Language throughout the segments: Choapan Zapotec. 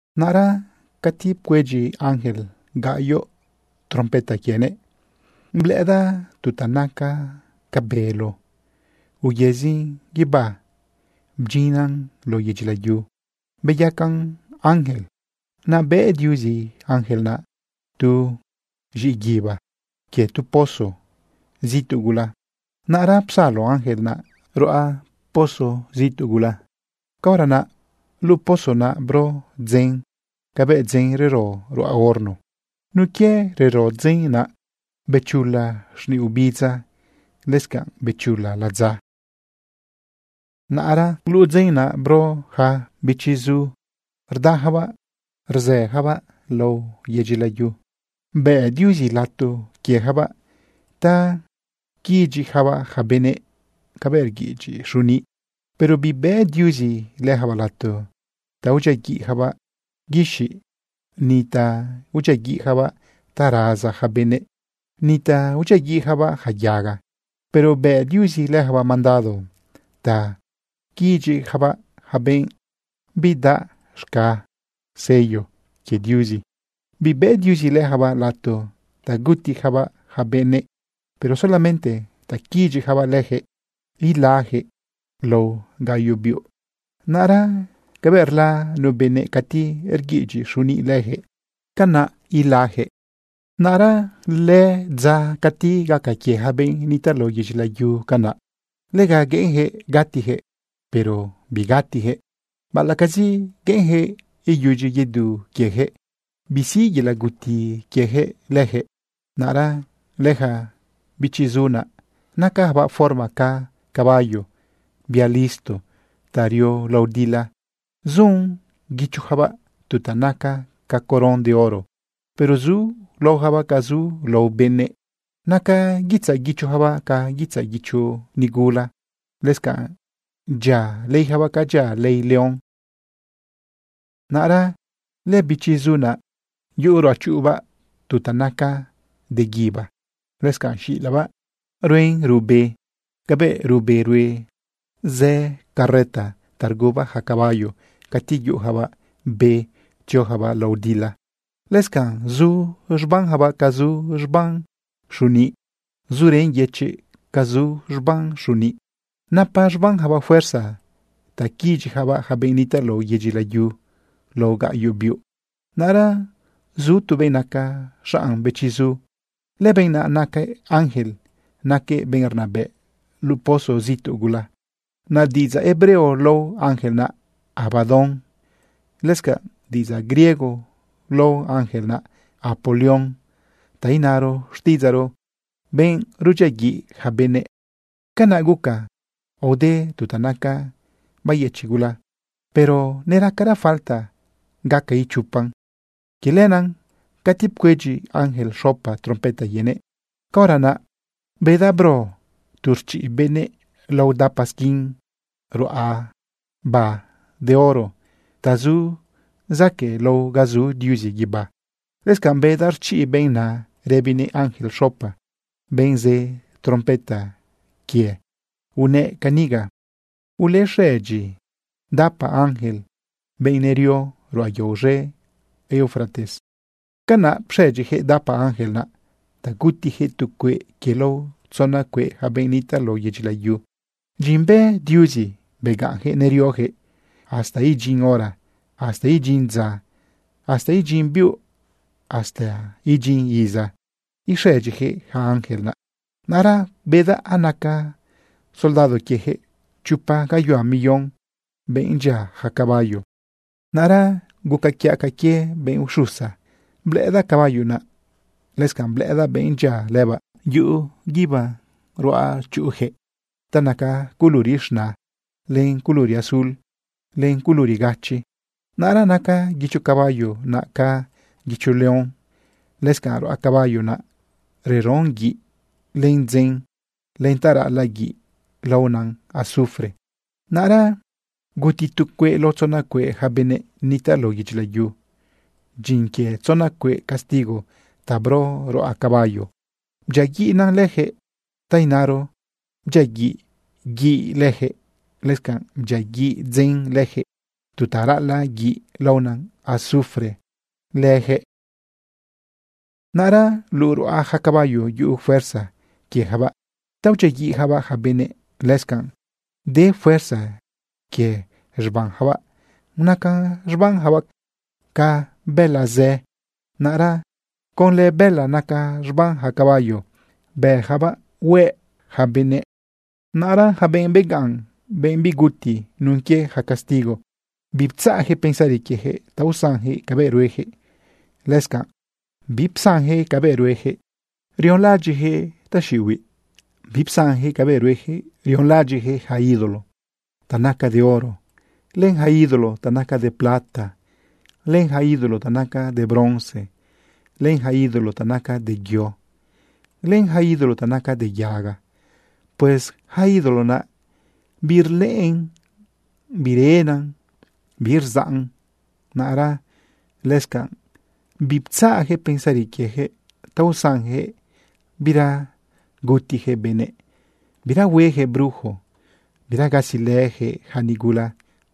Naꞌra cati pcuedyi ángel gaꞌyoꞌ trompeta quienëꞌ, blëꞌëdaꞌ tu ta naca ca bélo uyëzin guibá bdyinnan lao yedyi layu beyacan ángel. Naꞌ bëꞌ Diuzi ángel naꞌ tu z̃iꞌguiba quie tu poso zituꞌ gula. Naꞌra psalo ángel naꞌ ruꞌa poso zituꞌ gula. Caora naꞌ luꞌu poso naꞌ bro dzen cabëꞌ dzen rero ruꞌa horno. Nun quie rero dzen naꞌ, bechula xniꞌ ubidza, lëscanꞌ bechula ladza. Naꞌra luꞌu dzen naꞌ bro ja bëchiꞌzu rdajabaꞌ rzëjabaꞌ lao yedyi layu. Bëꞌ Diuzi lato quiejabaꞌ ta quiꞌidyiꞌjabaꞌ ja benëꞌ cabëꞌ rguiꞌidyiꞌ xuniꞌ. Pero bibëꞌ Diuzi lëjabaꞌ lato ta udyiaguiꞌjabaꞌ guixiꞌ ni ta udyiaguiꞌjabaꞌ ta raza ja benëꞌ, ni ta udyiaguiꞌjabaꞌ ja yaga. Pero bë Diuzi lëjabaꞌ mandado ta quiꞌidyiꞌjabaꞌ ja benꞌ bidaꞌ z̃ga sello quie Diuzi. Bibëꞌ Diuzi lëjabaꞌ lato ta gutijabaꞌ ja benëꞌ, pero solamente ta quiꞌidyiꞌjabaꞌ lëjëꞌ ilajëꞌ lao gaꞌyoꞌ biuꞌ. Naꞌra cabëꞌ rla nu benëꞌ cati rguiꞌidyiꞌ xuniꞌ lëjëꞌ, canaꞌ ulajëꞌ. Naꞌra lëdza cati gaca quie ja benꞌ nitaꞌ lao yedyi layu canaꞌ, lega gueꞌenjëꞌ gatijëꞌ, pero bigatijëꞌ. Baꞌalaꞌcazi gueꞌenjëꞌ iyudyi yedu quiejëꞌ, bisiꞌ yelaꞌ guti quiejëꞌ lëjëꞌ. Naꞌra lëja bëchiꞌzu naꞌ, nacajabaꞌ forma ca caballo, bia listo ta rio lao dila. Zun guichojabaꞌ tu ta naca ca coron de oro. Pero zu laojabaꞌ ca zu lao benëꞌ. Naca guitzaꞌ guichojabaꞌ ca guitzaꞌ guicho nigula. Lëscanꞌ dyia leijabaꞌ ca dyia lei león. Naꞌra lëbëchiꞌzu naꞌ, yuꞌu ruꞌachuꞌubaꞌ tu ta naca de guíba. Lëscanꞌ xilabaꞌ ruen ruꞌbe cabëꞌ ruꞌbe rue zë carreta ta rguba ja caballo cati yuꞌujabaꞌ be tziojabaꞌ lao dila. Lëscanꞌ zu z̃bambaꞌ ca zu z̃bam xuniꞌ. Zurën yëchiꞌ ca zu z̃bam xuniꞌ. Napa z̃banjabaꞌ fuerza ta quiꞌidyiꞌjabaꞌ ja benꞌ nitaꞌ lao yedyi layu lao gaꞌyoꞌ biuꞌ. Naꞌra zu tu benꞌ naca xaꞌn bëchiꞌzu. Lëbenꞌ naꞌ naquëꞌ ángel, naquëꞌ benꞌ rnabëꞌ luꞌu poso zituꞌ gula. Naꞌ diꞌidzaꞌ hebreo lao ángel naꞌ Abadón. Lëscanꞌ diꞌidzaꞌ griego lao ángel naꞌ Apolión, ta inaro xtiꞌidzaꞌro, benꞌ rudyiaguiꞌ ja benëꞌ. Canaꞌ guca aode tu ta naca bayëchiꞌ gula, pero neracara falta gaca ichopan. Quie lenaꞌ cati pcuedyi ángel xopa trompeta quienëꞌ, caora naꞌ bedaꞌ bro tu rchiꞌ benëꞌ lao dapa squin ruꞌaba de oro ta zu zaquëꞌlao ga zu Diuzi guibá. Lëscanꞌ bedaꞌ rchiꞌ benꞌ naꞌ rëbinëꞌ ángel xopa, benꞌ zë trompeta quie unëꞌ caniga: ―Ulexëdyi dapa ángel, benꞌ nerio ruꞌa yao z̃e Eufrates. Canaꞌ pxëdyijëꞌ dapa ángel naꞌ ta gutijëꞌ tu cueꞌ quie lao tzona cueꞌ ja benëꞌ nitaꞌ lao yedyi layu. Dyin bë Diuzi begaꞌnjëꞌ neriojëꞌ hasta idyin hora, hasta idyin dza, hasta idyin biuꞌ, hasta idyin iza ixëdyijëꞌ ja ángel naꞌ. Naꞌra bedaꞌ anaca soldado quiejëꞌ chopa gayuhua million, benꞌ dyia ja caballo. Naꞌra guca quiaꞌ ca quie benꞌ uxusa, blëꞌëdaꞌ caballo naꞌ. Lëscanꞌ blëꞌëdaꞌ benꞌ dyia lëbaꞌ yuꞌu guíba ruꞌachuꞌujëꞌ ta naca culuri z̃na, len culuri azul, len culuri gachi. Naꞌra naca guicho caballo naꞌ ca guicho león. Lëscanꞌ ruꞌa caballo naꞌ reron guiꞌ len dzen len ta raꞌalaꞌ guiꞌ laona azufre. Naꞌra guti tu cueꞌ lao tzona cueꞌ ja benëꞌ nitaꞌ lao yedyi layu. Dyin quie tzona cueꞌ castigo ta bro ruꞌa caballo bdyiaguiꞌnan lëjëꞌ, ta inaro, bdyiaguiꞌ guiꞌ lëjëꞌ, lëscanꞌ bdyiaguiꞌ dzen lëjëꞌ, tu ta raꞌalaꞌ guiꞌ laona azufre lëjëꞌ. Naꞌra luꞌu ruꞌa ja caballo yuꞌu fuerza quiejabaꞌ ta udyiaguiꞌjabaꞌ ja benëꞌ. Lëscanꞌ de fuerza quie z̃banjabaꞌ. Naca z̃banjabaꞌ ca bëla zë. Naꞌra conlë bëla naca z̃ban ja caballo bëjabaꞌ hueꞌ ja benëꞌ. Naꞌra ja benꞌ begaꞌn, benꞌ biguti nun quie ja castigo, biptzaꞌjëꞌ pensari quiejëꞌ ta usanjëꞌ cabëꞌ ruejëꞌ. Lëscanꞌ bipsanjëꞌ cabëꞌ ruejëꞌ rionlaꞌadyiꞌjëꞌ taxiꞌihuiꞌ, bipsanjëꞌ cabëꞌ ruejëꞌ rionlaꞌadyiꞌjëꞌ ja ídolo ta naca de oro, len ja ídolo ta naca de plata, len ja ídolo ta naca de bronce, len ja ídolo ta naca de yo, len ja ídolo ta naca de yaga. Pues yaca ídolo naꞌ birlëꞌën, birena, birzaꞌn. Naꞌra lëscanꞌ biptzaꞌjëꞌ pensari quiejëꞌ ta usanjëꞌ bira gutijëꞌ benëꞌ, bira huejëꞌ brujo, bira gasilëjëꞌ ja nigula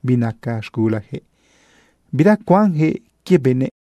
binaca z̃gulajëꞌ, bira cuanjëꞌ quie benëꞌ.